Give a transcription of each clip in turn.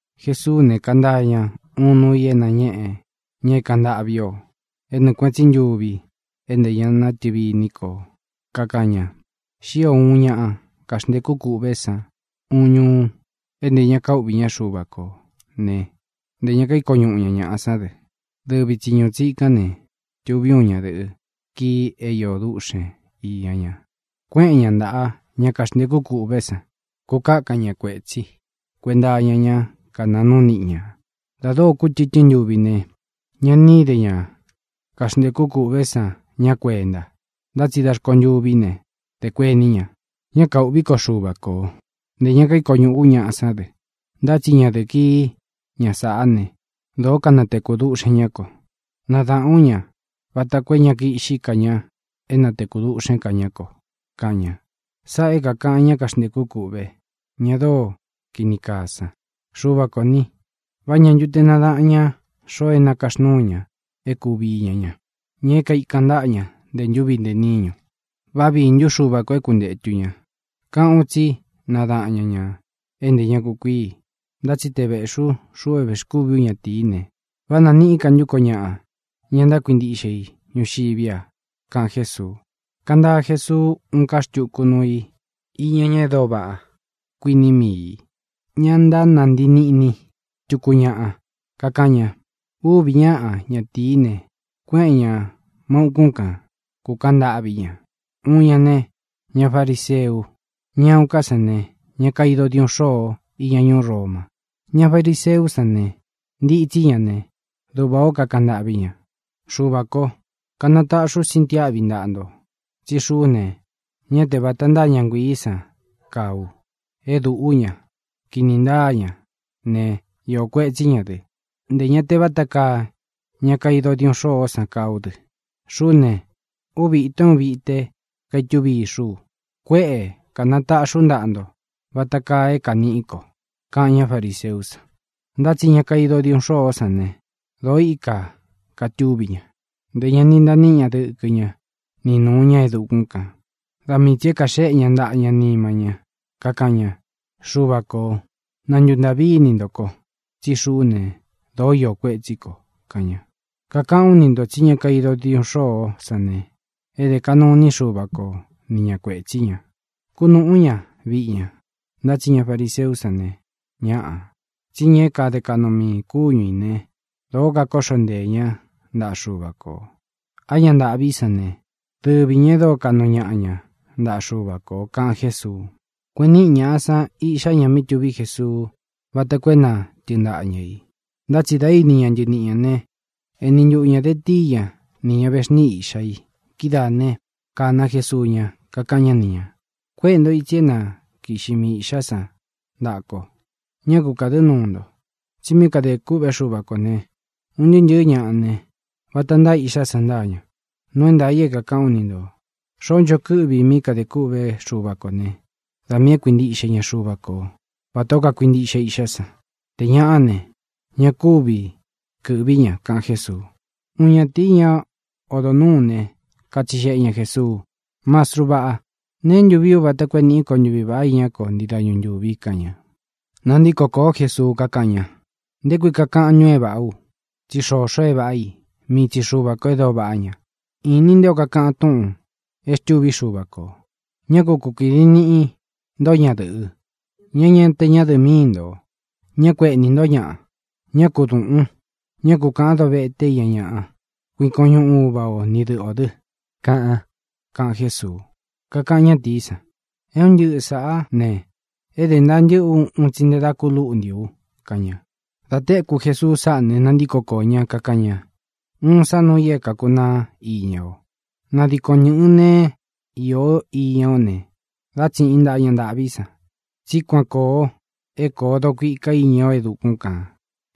Jesuú ne, kantaa ña uun nuu i é nañéꞌe ña é kāꞌan ntâꞌví ō é nɨɨ kuēꞌen tsí ntuvi é ntē ña natɨvi iní kō. Kakaꞌan ña: —Xío uun ña kaxntēkú kûꞌvé san uun ñuu é ntē ña kaúꞌvī ñá Xuva kō né, ntē ña kaíko ñuꞌu ña ñāꞌa sán dɨ. Dɨvi tsi ñūú tsikán ne, tuví uun ñadɨ̄ꞌɨ kii é īó duꞌxen īña ña. Kuéꞌen ña ntaꞌa ña kaxntēkú kûꞌvé san, kukakan ña kuétsi kuēnta iña ñá kanaa núu niꞌi ñā. Dā dóo kútɨtɨ́n ntuvi ne, ña ni íde ña kaxntēkú kûꞌvé san ñá kuenta. Ntá tsi da rkontûví ne, dē kuení ña: “Ña kaûꞌví ko Xuva ko, ntē ña kaíko ñūꞌú u ñaꞌa sán dɨ, ntá tsi ñadɨ̄ꞌɨ kií, ña sāꞌá ne, dōó kanatekū duꞌxen ñá ko. Nadaꞌān ú ña vata koo é ña kiꞌxí ka ña é natekū duꞌxén ka ñá ko”, kaꞌan ña. ʼSáꞌā é kākaꞌan ñá kaxntēkú kûꞌve, ña dóo kini kaa san. Xuva kō ni, ¿vá ñā ntu te nadáꞌan ña xoo é nakaxnúu ña é kūvi iña ña, ña é kaikan ntáꞌa ña ntē ntúvi ntē níñu? ¿Vá viī ntú Xuva kō é kuntētu ña? Káꞌān u tsí nadaꞌan ña ñā é nte ña kukuíi. Ntá tsi te vēꞌxi u, xuꞌu é vēxkúvī ú ñatīí ne, ¿vá nāniꞌí ka ntú ko ñaꞌa, ña e ntákuintiꞌxe i ñuxiví a? —kaꞌan Jésuu. Kantaa Jesuu úun ká xtuku nuu i iña ñá e dóo vaꞌá, kuiní mii ī, ña ntánantii niꞌni tuku ñāꞌa. Kakaꞌan ña: —Uvi ñáꞌa ñatīí ne, kuéꞌen ñā má ūkún kan, kūkaꞌan ntâꞌví ña. Uun ña ne, ña fariseu. Ña uun ñaꞌa ká san ne, ña kaido diuꞌun xôo íña ñuú Roma. Ña fariseú san ne, ntitsí ña ne, duꞌvā ó kakaꞌan ntâꞌví ña: “Xuvā kó, kanataꞌxi ú sintiáꞌvi ntaꞌa nto tsí xuꞌú ne, ñá te vāta ntáa ña nguiī san kaa u: é dūꞌú ña, kini ntáa ña ne, iō kuetsí ña dɨ; ntē ña te váta kaa ña kaido diuꞌun xôó san kaa ú dɨ. Xuꞌú ne, úvi īto é uun vite kaitúvi ixú u. Kuéꞌe kanatāꞌxi ú ntaꞌa nto vata kaa é kāniꞌí ko”, kaꞌan ñá fariseú san. Ntá tsi ña kaido diuꞌun xôó san ne, dōo íka kātuví ña; ntē ña ni ntaa níꞌi ña dɨ̄kɨ ña ni nuu ña e dukún kān. Da mii tsī e kaxéꞌe ña ntaꞌa ña nima ñá, kakaꞌan ña: “¡Xuva ko, na ntūntaꞌví ini nto ko, tsí xuꞌú ne, dōó iō kuetsí ko!”, kaꞌan ña. Kakaꞌán u ni ntō tsí ña kaido diuꞌun xôó san ne, é dé kaꞌnu iní Xuva ko ni ñā kuetsí ña, kúnūꞌú ña viꞌi ña. Ntá tsi ña fariseú san ne, ñáꞌā. Tsí ña é kade kaꞌnu miī kúñu ī né, dōo kakóꞌxo nteē ñá ntaꞌa Xuva kō. Á ña ntāꞌví san ne, dɨvi ñā e dóo kaꞌnu ñaꞌa ña ntaꞌa Xuva kō —kaꞌan Jésuu. Kueꞌen níꞌi ñāꞌa san iꞌxá ña mí tuví Jesuu váta ko é na tɨɨn ntaꞌa ña ī. Ntá tsi dā íni ña ntɨniꞌi ñā né, eni ntuꞌu ñā de tíi ña ni ña vexníꞌi iꞌxá i. Kidáa ne, kāna Jesuú ña, kakaꞌan ñá ni ñā: —Kuéꞌe nto ītsi é na kiꞌxi mii īꞌxá san ntaꞌa ko. Ñá ku kādɨ́ nuu nto, tsi mí kadē kûꞌvé Xuva kō ne, un ntɨɨ́ ntɨ̄ɨ́ ñaꞌa ne, vata ntáa iꞌxá san ntáa ña. Nuu é ntaā i é kākaꞌán u ni ntō: Xoó ncho kɨ́ꞌvi i mí kadē kûꞌvé Xuva ko ne, da miī é kuintiꞌxe ña Xuva ko vatā ó kakuintiꞌxe iꞌxá san. Tē ñaꞌá ne, ña kúvi kɨ̄ꞌví ña —kaꞌan Jésuu. Uun ñatīí, ña odo nūú ne, katsixeꞌe ña Jēsuu: —Mastru vaꞌá, ¿neé ntu vii ú vata koo é nīꞌí ko ntuvi vāꞌa iñá ko ntii dañu ntūvi? —kaꞌan ña. Nantíko kōó Jesuu, kakáꞌan ña: —¿Nté kui kakaꞌan ntun é vāꞌá u? Tsí xoxo e váꞌa i; mii tsi Xuva kō e dóo vaꞌá ña. Inin nté o kakaꞌan túꞌūn e xtúvi Xúva kō: “Ñá ku kukīdi niꞌi nto ñadɨꞌɨ, ña é ña te ñádɨ̄ꞌɨ míi ō. Ñá ku ēꞌnín ñaꞌa. Ñá ku dūꞌun. Ñá ku kāꞌán dovete iña ñaꞌa. Kuikon ñuꞌun uva ō, ni dɨꞌɨ ō dɨ”, kaꞌan —kaꞌan Jésuu. Kakaꞌan ñátīí san: —É un ntɨꞌɨ sāꞌá ne, é dē ntaa ntɨ́ꞌɨ ú un tsi nte dá ku lúꞌnti u —kaꞌan ña. Dā téku Jesuu sáꞌā ne, nantíko koō ñá, kakaꞌan ña: —Uun sá nuu i é kākunaá iña o: nadikon ntɨ̄ꞌɨn neé īo iña ó ne, dá tsiꞌin ntaꞌa ña ntāꞌví san, tsí kuan kōo é koo dokuika iña o e dukún kān.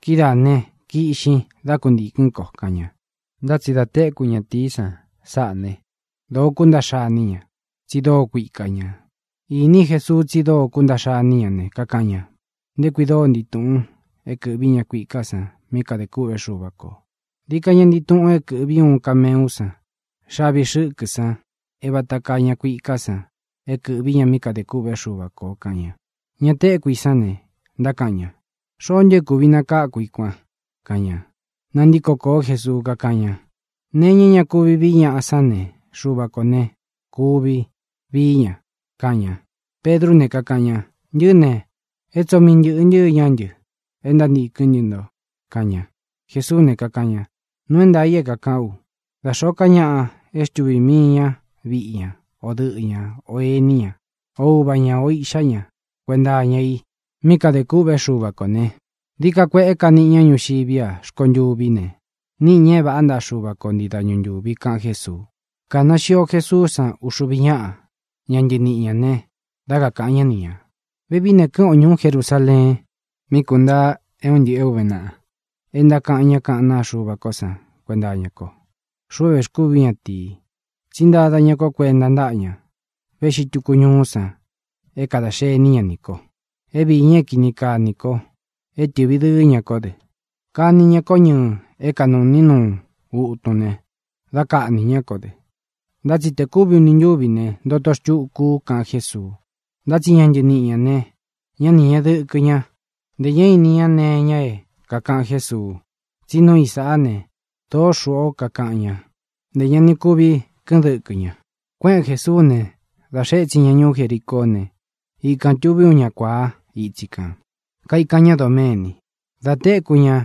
Kidáā ne, kiꞌxin, dá kuntīkɨ́n ko —kaꞌan ña. Ntá tsi dā téku ñatīí san sáꞌā né, dōo kúntaꞌxa iní ña, tsi dóo kuika ñā. Īní Jesuu tsí dóo kúntaꞌxa iní ña ne, kakaꞌan ña: —¡Nté kui dóo ntii tūꞌun é kɨ̄ꞌví ña kuiká san mí kadē kûꞌvé Xuva kō! Dií ka ña ntii tuꞌun é kɨ̄ꞌví uun kameú san xavi xɨ́kɨ san é vāta kaa ña kuiká san é kɨ̄ꞌví ña mí kadē kûꞌvé Xuva kō —kaꞌan ña. Ña téku i sán ne, ntákaꞌan ña: —¿Xoó ntu é kūvi nakáku i kuan? —kaꞌan ña. Nantíko kōó Jesuu, kakáꞌan ña: —Nee iña é ña kuvi vií ñaꞌa sán ne, Xuva kō ne, kuvi vií ña —kaꞌan ña. Pedrú ne, kakaꞌan ña: —Ntɨꞌɨ́ ne, é tsoo mii ntɨ̄ꞌɨ ntɨ́ iñá ntɨ e ntántīkɨ́n ntɨ nto —kaꞌan ña. Jesuú ne, kakaꞌan ña: —Nuu é ntaā i é kākaꞌán u: Da xōó ka ñaꞌa é xtuvī mii ña viꞌi ña, o dɨꞌɨ ña, o ēní ña, o uva ñā, ō iꞌxá ña kuenta iña i mí kadē kûꞌvé Xuva kō ne, dií ka kueꞌé ka niꞌi ña ñuxiví a; rkontûví ne, níꞌi ña é vāꞌá ntaꞌa Xuva ko ntii dañu ntūvi —kaꞌan Jésuu. Kāna xio Jesuú san uxuvi ñáꞌa ña ntɨniꞌi ñā ne, dá kakāꞌan ñá ni ñā: —Vevií ne, kɨ́ꞌɨn o ñūú Jerusaleen, mí kuntaa é un ntɨꞌɨ̄ é uve naꞌa e ntákaꞌan ñá kaꞌán naa Xuva ko san kuenta iñá ko, xuꞌu é vēxkúvi ú ñatīi. Tsí ntada ña kó kuenta ntáꞌa ña véꞌxi tūku ñuú san é kadā xení ña nī ko, é viī ña é kini kaa nī ko, é tɨꞌvi dɨɨ́ ña kó dɨ. Kani ña kó ñɨɨ é kanuꞌni nuu utun ne, dá kaꞌnī ñá ko dɨ, ntá tsi te kúvi uni ntúvi ne, ntoto xtuku u —kaꞌan Jésuu. Ntá tsi ña ntɨniꞌi ñā ne, ñá ni ñēꞌe dɨkɨ ña; ntē ñá ini ña nee iña é kākaꞌan Jésuu, tsí nuu i sáꞌa ne, dōó xūꞌú ō kakaꞌan ña; ntē ña ni kuvi kɨ́ꞌɨn dɨkɨ ña. Kuéꞌen Jēsuú ne, dā xee étsin ña ñuú Jericoó ne, ikān tuví uun ña kuāá itsi kān, kaikan ñá doméni. Da téku ña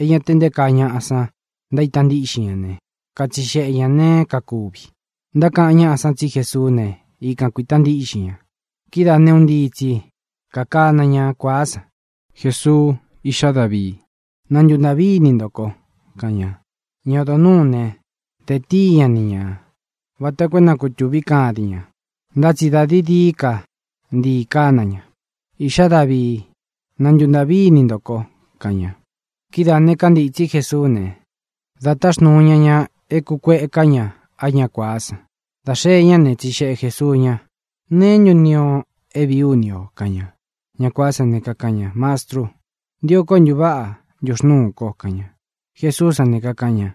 é ña te nté kaa ñaꞌa san ntaíta ntíꞌxin ña ne, katsixeꞌe ñā neé kakuvi. Ntákaꞌan ñáꞌa san tsi Jésuú ne, ikan kuīta ntíꞌxin ña. Kidáa ne, un ntii tsi kakana ña kuāá san: —¡Jesuu, iꞌxá Davii, na ntuntāꞌví ini nto ko! —kaꞌan ña. Ña odo nūú ne, de tíi ña ni ñā vata koo é na kūtuvi kadin ña. Ntá tsi dā dií dií ka ntii kána ña: —¡Iꞌxá Davii, na ntuntāꞌví ini nto ko! —kaꞌan ña. Kidáā ne, kántītsí Jesuú ne, dā táxnuu ña ñā é kūkueká ña á ña kuāá san. Dā xee ñá ne, tsixeꞌe Jēsuu ña: —¿Neé ntu ntio o é vīí u ni ō? —kaꞌan ña. Ña kuāá san ne, kakaꞌan ña: —Mastru, ntio ko é ntūváꞌa ntuxnuú ko —kaꞌan ña. Jesuú san ne, kakaꞌan ña: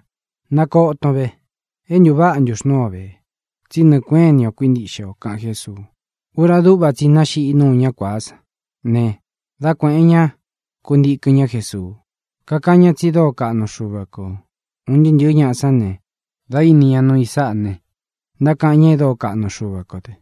—Nakoton ve. É ntūváꞌa ntuxnúu o vē, tsí nɨɨ̄ kuéꞌen ini o kuíntiꞌxe o —kaꞌan Jésuu. Ura dúꞌva tsi i náxiꞌí nuu ñá kuāá san ne, dá kuēꞌen ña kuntikɨn ñá Jesuu, kakáꞌan ñá tsi dóo kaꞌnu Xuva kō. Un ntɨɨ́ ntɨ̄ɨ́ ñaꞌa sán ne, dā íni ña nuu i sáꞌa ne, ntákaꞌan ña e dóo kaꞌnu Xuva kō dɨ.